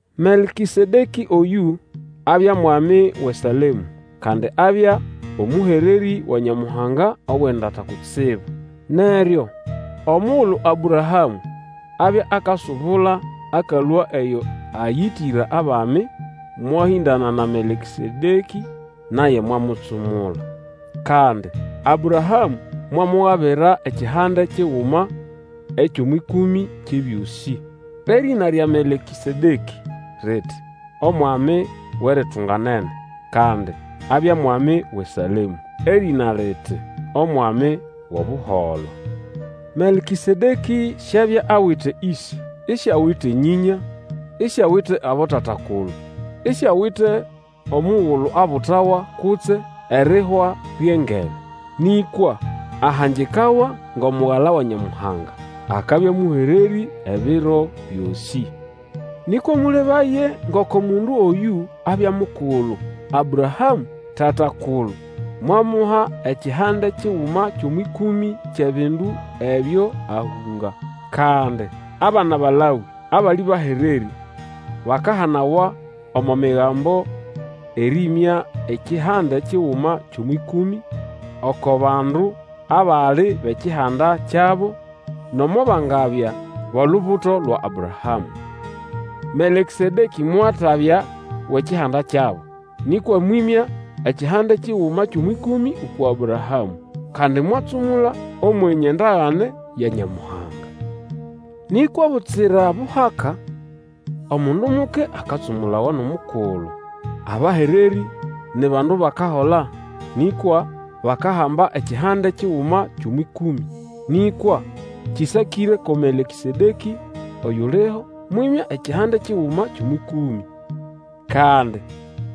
Melkĩsedekĩ oyũ, abya mwami wʼeSalemũ, kandi abya omũhererĩ wa Nyamuhanga Owendata Kutsibu. Neryo omugulu Abrahamũ abya akasubula akalũa eyo ayĩtĩra abami, mwahĩndana na Melkĩsedekĩ naye mwamutsumula. Kandi Abrahamũ mwamugabira ekihande kiguma ekyʼomwʼĩkũmĩ kyʼebyosĩ. Erĩna lya Melkĩsedekĩ riti, Omwami Wʼeritunganene; kandi abya mwami wʼeSalemũ, erĩna liti, Omwami wʼobuholo. Melkĩsedekĩ siabya awite ĩse, isiawite nyĩnya isiawite abotata-kulu, isiawite omugulu abutawa kutse erihwa lyʼengebe. Nĩkwa ahangikawa ngʼomugala wa Nyamuhanga. Akabya mũhererĩ ebiro byosĩ. Nĩkwa mũlebaye ngoko mundu oyũ abya mukulu. Abrahamũ, tata-kulu, mwamuha ekihande kiguma kyʼomwʼĩkũmĩ kyʼebindu ebyo ahũnga. Kandi abana ba Lawĩ abali bahererĩ bakahanawa omo Migambo erĩmya ekihande kiguma kyʼomwʼĩkũmĩ oko bandu abali bʼekihanda kyabo, nomo bangabya bʼolubuto lwa Abrahamũ. Melkĩsedekĩ mwatabya wʼekihanda kyabo, nĩkwa mwĩmya ekihande kiguma kyʼomwʼĩkũmĩ uku Abrahamũ, kandi mwatsumula Omwenye ndagane ya Nyamuhanga. Nĩkwa butsira buhaka omundu muke akatsumulawa nʼomukulu. Abahererĩ ni bandu bakahola nĩkwa bakahamba ekihande kiguma kyʼomwʼĩkũmĩ. Nĩkwa kĩsakĩre ko Melkĩsedekĩ oyuliho, mwĩmya ekihande kiguma kyʼomwʼĩkũmĩ. Kandi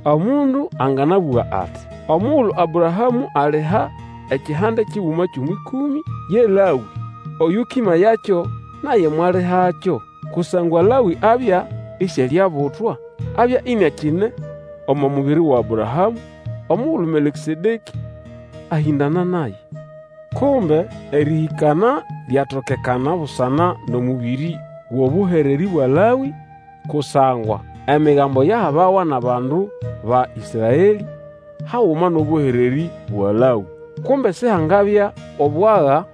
omundu anganabũga ati, omugulu Abrahamũ aliha ekihande kiguma kyʼomwʼĩkũmĩ, ye Lawĩ (oyũkĩmayakyo) naye mwalihakyo. Kusangwa Lawĩ abya isialiabutwa, abya iniakine omo mubiri wa Abrahamũ omugulu Melkĩsedekĩ ahĩndana naye. Kumbe erĩhĩkana lyatokekana busana nʼomũbĩrĩ wʼobũhererĩ bwa Lawĩ, kusangwa Emigambo yahabawa nʼabandu ba Ĩsraelĩ haguma nʼobũhererĩ bwa Lawĩ, kumbe Sihangabya obwaga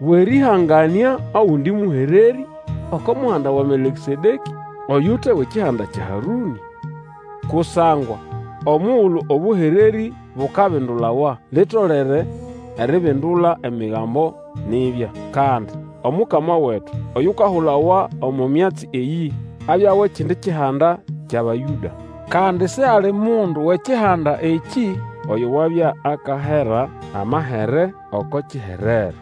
bwʼerĩhanganĩa ogundi mũhererĩ oko muhanda wa Melkĩsedekĩ oyute wʼekihanda kya Harũnĩ. Kusangwa omugulu obũhererĩ bukabindulawa, litolere eribindula Emigambo nibya. Kandi Omukama wetu, oyukahulawa omo myatsi eyĩ, abya wʼekindi kihanda kyʼAbayũda. Kandi sihali mundu wʼekihanda ekĩ oyo wabya akahera amahere oko kiherero.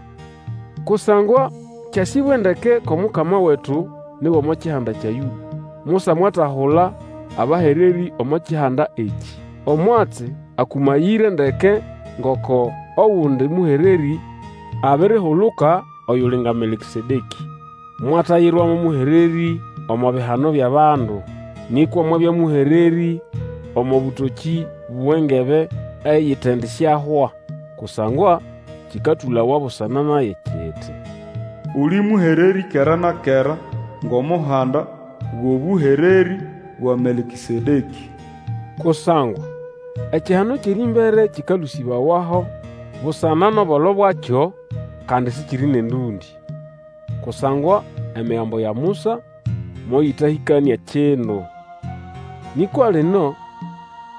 Kusangwa kyasĩbwe ndeke kwʼOmukama wetu ni wʼomo kihanda kya Yũda. Musa mwatahula abahererĩ omo kihanda ekĩ. Omwatsi akũmayĩre ndeke ngoko ogundi mũhererĩ abirihuluka, oyuli nga Melkĩsedekĩ. Mwatayirwa mo mũhererĩ omo bihano byʼabandu, nĩkwa mwabya mũhererĩ omo bũtokĩ bwʼengebe eyitendisyahwa. Kusangwa kĩkatũlawa busana naye kiti, Uli mũhererĩ kera na kera Ngʼomuhanda wʼobũhererĩ bwa Melkĩsedekĩ. Kusangwa ekihano kyʼerĩmbere kĩkalũsĩbawaho busana nʼobolo bwakyo, kandi sikiri nʼendũndĩ. Kusangwa Emigambo ya Musa moyĩtahĩkanĩa kindu. Nĩkwa lino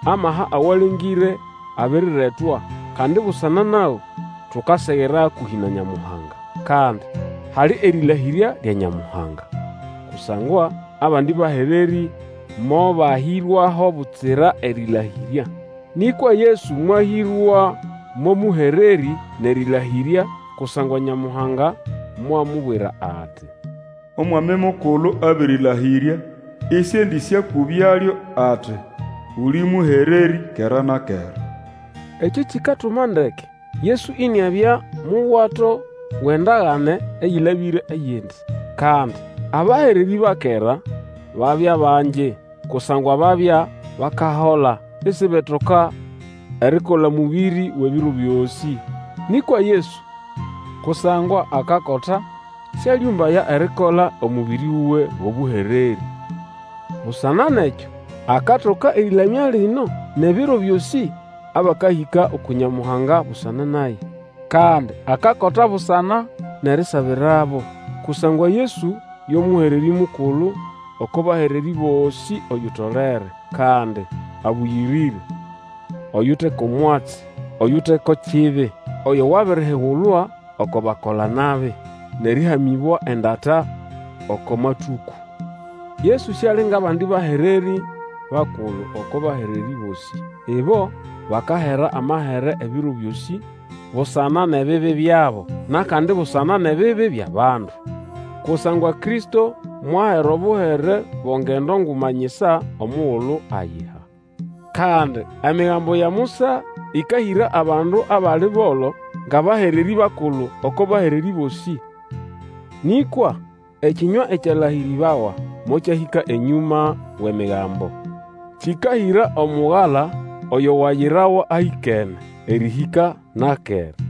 amaha awalengĩre abiriretwa; kandi busana nago tukasegera hakũhĩ na Nyamuhanga. Kandi hali erĩlahĩrya lya Nyamuhanga. Kusangwa abandi bahererĩ mobahĩrwaho butsira erĩlahĩrya. Nĩkwa Yesu mwahĩrwa mo mũhererĩ nʼerĩlahĩrya, kusangwa Nyamuhanga mwamubwira ati, Omwami Mukulu abĩrĩlahĩrya, Isiendĩsyakũbyalyo ati, Uli mũhererĩ kera na kera. Ekĩ kikatuma ndeke Yesu iniabya muwato wʼendagane eyĩlabĩre eyindi. Kandi abahererĩ ba kera babya bangi kusangwa babya bakahola isibetoka erikola omũbĩrĩ wʼebiro byosĩ. Nĩkwa Yesu kusangwa akakota syalĩũmbaya erikola omũbĩrĩ wuwe wʼobũhererĩ. Busana nʼekyo akatoka erĩlamya lino nʼebiro byosĩ abakahĩka uku Nyamuhanga busana naye. Kandi akakota busana nʼerisabirabo. Kusangwa Yesu yo Mũhererĩ Mukulu oko bahererĩ bosĩ, oyutolere. Kandi abũyĩrĩre, oyute ko mwatsi, oyute ko kibi, oyo wabirihigulwa oko bakola-nabi, nʼerĩhamĩbwa endata oko matũkũ. Yesu siali ngʼabandi bahererĩ bakulu oko bahererĩ bosĩ. Ibo bakahera amahere ebiro byosĩ busana nʼebibi byabo, nʼakandi busana nʼebibi byʼabandu. Kusangwa Kristo mwahera obuhere bo ngendo nguma nyisa omugulu ayiha. Kandi Emigambo ya Musa ĩkahĩra abandu abali bolo, ngʼabahererĩ bakulu oko bahererĩ bosĩ. Nĩkwa ekĩnywa ekyalahĩrĩbawa mokyahĩka enyũma wʼEmigambo, kĩkahĩra Omugala, oyo wayirawa ahĩkene, erĩhĩka na kera.